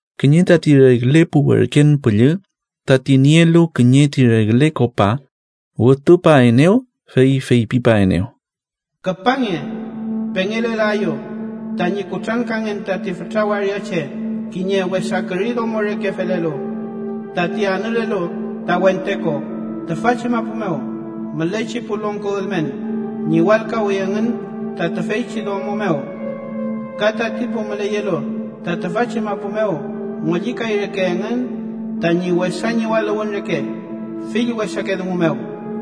Kiñe tati regle pu werken püllü tati nielu kiñe ti regle kopa, wütupaenew, fey feypipaenew: “Küpange, pengelelaeyu tañi kutrankangen tati fütra waria che kiñe wesa küri domo reke felelu, tati anülelu ta wente ko. Tüfachi mapu mew mülechi pu longko ülmen ñiwalkawi engün ta tüfeychi domo mew, ka tati pu müleyelu ta tüfachi mapu mew ngollikay reke engün tañi wesa ñiwaluwün reke fill wesake dungu mew.”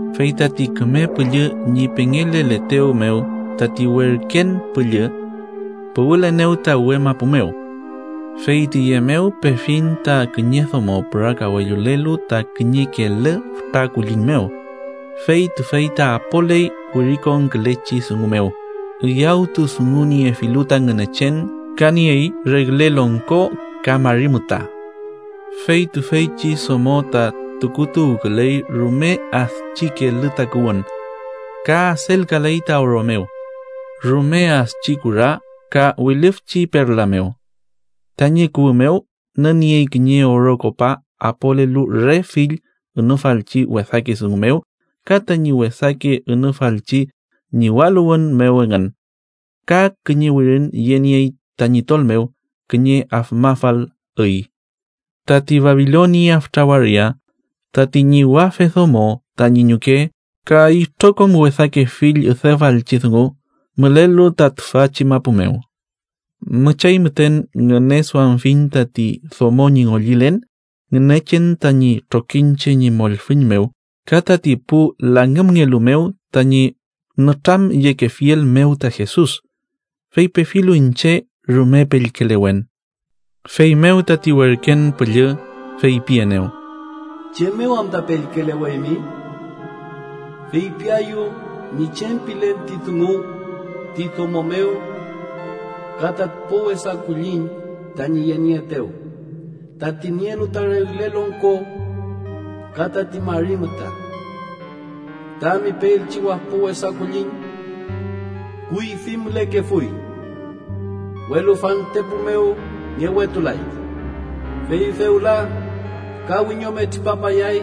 Fey tati Küme Püllü ñi pengeleletew mew, tati werken püllü puwülenew ta uwe mapu mew. Fey tiye mew pefiñ ta kiñe domo pürakawellulelu ta kiñe kelü fütra kulliñ mew, fey tüfey ta apoley wirikonkülechi dungu mew üyawtudunguniefilu ta Ngünechen ka niey regle longko ka mari müta. Fey tüfeychi domo ta tukutuwküley rume adchi kelü takuwün, ka adelkaley ta oro mew, rume adchi kura ka wilüfchi perla mew. Tañi kuwü mew nüniey kiñe oro kopa apolelu re fill ünufalchi wesake dungu mew ka tañi wesake ünufalchi ñiwaluwün mew engün. Ka kiñe wirin yeniey tañi tol mew, kiñe afmafal üy: TATI BABILONIA FÜTRA WARIA, TATI ÑIWAFE DOMO TAÑI ÑUKE KA ITROKOM WESAKE FILL ÜDEFALCHI DUNGU MÜLELU TA TÜFACHI MAPU MEW. Müchay müten ngüneduamfiñ tati domo ñi ngollilen Ngünechen tañi trokiñche ñi mollfüñ mew ka tati pu langümngelu mew tañi nütramyekefiel mew ta Jesus. Fey pefilu iñche, rume pellkelewen. Feymew tati werken püllü feypienew: “¿Chem mew anta pellkeleweymi? Feypiaeyu ñi chem pilen ti dungu ti domo mew ka tati wapo wesa kulliñ tañi yenieetew, tati nielu ta regle longko ka tati mari müta. Tami peelchi wapo wesa kulliñ kuyfi mülekefuy, welu fantepu mew ngewetulay. Fey fewla, ka wiñome tripapayay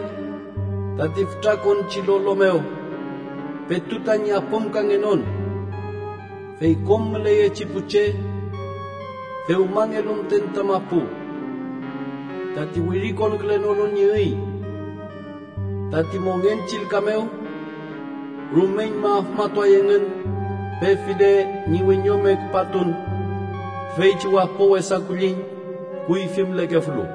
tati fütrakonchi lolo mew petu tañi apümkangenon. Fey kom müleyechi pu che dewmangelu müten ta mapu, tati wirikonkülenolu ñi üy tati mongen chillka mew, rumeñma afmatuay engün, pefile ñi wiñome küpatun tüfeychi wapo wesa kulliñ kuyfi mülekefulu.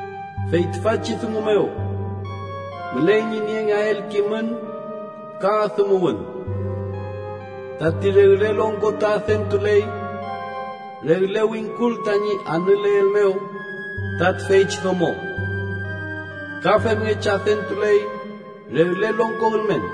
“Fey tüfachi dungu mew müley ñi niengeael kimün ka adümuwün: Tati regle longko ta adentuley regle wingkul tañi anüleel mew ta tüfeychi domo. Ka femngechi adentuley regle longko ülmen.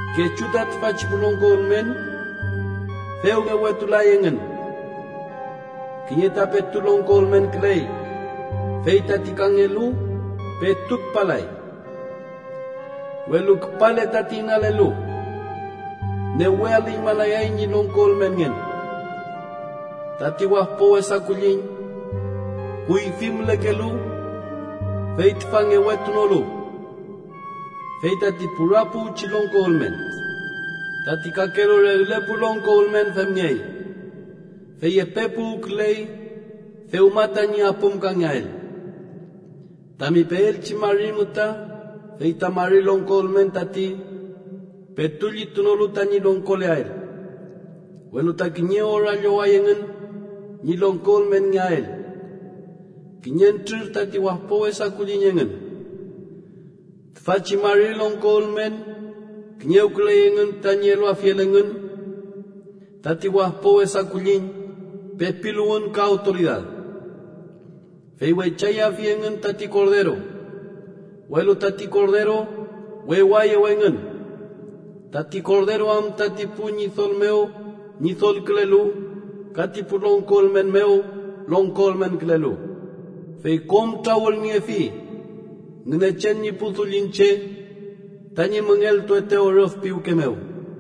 Kechu ta tüfachi pu longko ülmen dew ngewetulay engün, kiñe ta petu longko ülmenküley, fey tati kangelu petu küpalay. Welu küpale tati inalelu, newe alüñmalayay ñi longko ülmenngen. Tati wapo wesa kulliñ kuyfi mülekelu fey tüfa ngewetunolu, fey tati pura puwchi longko ülmen. Tati kakelu regle pu longko ülmen femngey, fey epe puwküley dewma tañi apümkangeael. “Tami peelchi mari müta fey ta mari longko ülmen tati petu llitunolu tañi longkoleael, welu ta kiñe ora lloway engün ñi longko ülmenngeael, kiñentrür tati wapo wesa kulliñ engün. Tüfachi mari longko ülmen kiñewküley engün tañi eluafiel engün tati wapo wesa kulliñ pepiluwün ka awtoridad. Fey weychayafi engün tati Korderu, welu tati Korderu wewaeyew engün, tati Korderu am tati pu ñidol mew Ñidolkülelu ka ti pu longko ülmen mew, Longko ülmenkülelu. Fey kom trawülniefi Ngünechen ñi pu dullin che, tañi müngeltuetew rüf piwke mew.”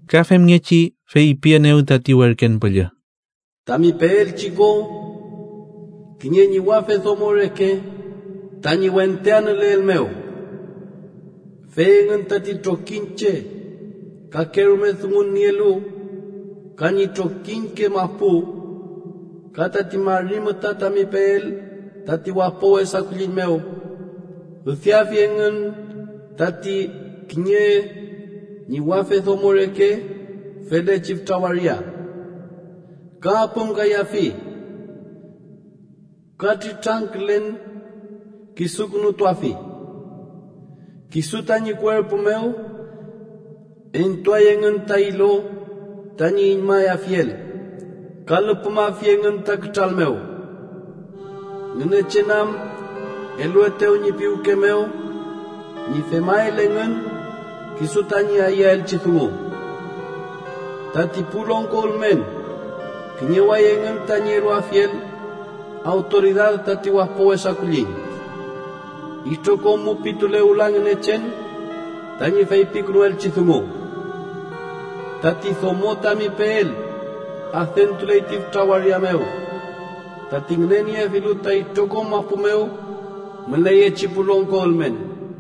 Ka femngechi feypienew tati werken püllü: “Tami peelchi ko, kiñe ñiwafe domo reke tañi wente anüleel mew, fey engün tati trokiñche kakerume dungun nielu ka ñi trokiñke mapu. Ka tati mari müta tami peel tati wapo wesa kulliñ mew, üdeafi engün tati kiñe ñiwafe domo reke felechi fütra waria. Ka apümkayafi ka triltrangkülen kisukünutuafi. Kisu tañi kuerpu mew entuay engün ta ilo tañi iñmayafiel, ka lüpümafi engün ta kütral mew. Ngünechen am eluetew ñi piwke mew ñi femael engün kisu tañi ayüelchi dungu: Tati pu longko ülmen kiñeway engün tañi eluafiel awtoridad tati wapo wesa kulliñ, itrokom mupitule wüla Ngünechen tañi feypikünuelchi dungu. Tati domo tami peel adentuley ti fütra waria mew, tati ngüneniefilu ta itrokom mapu mew müleyechi pu longko ülmen.”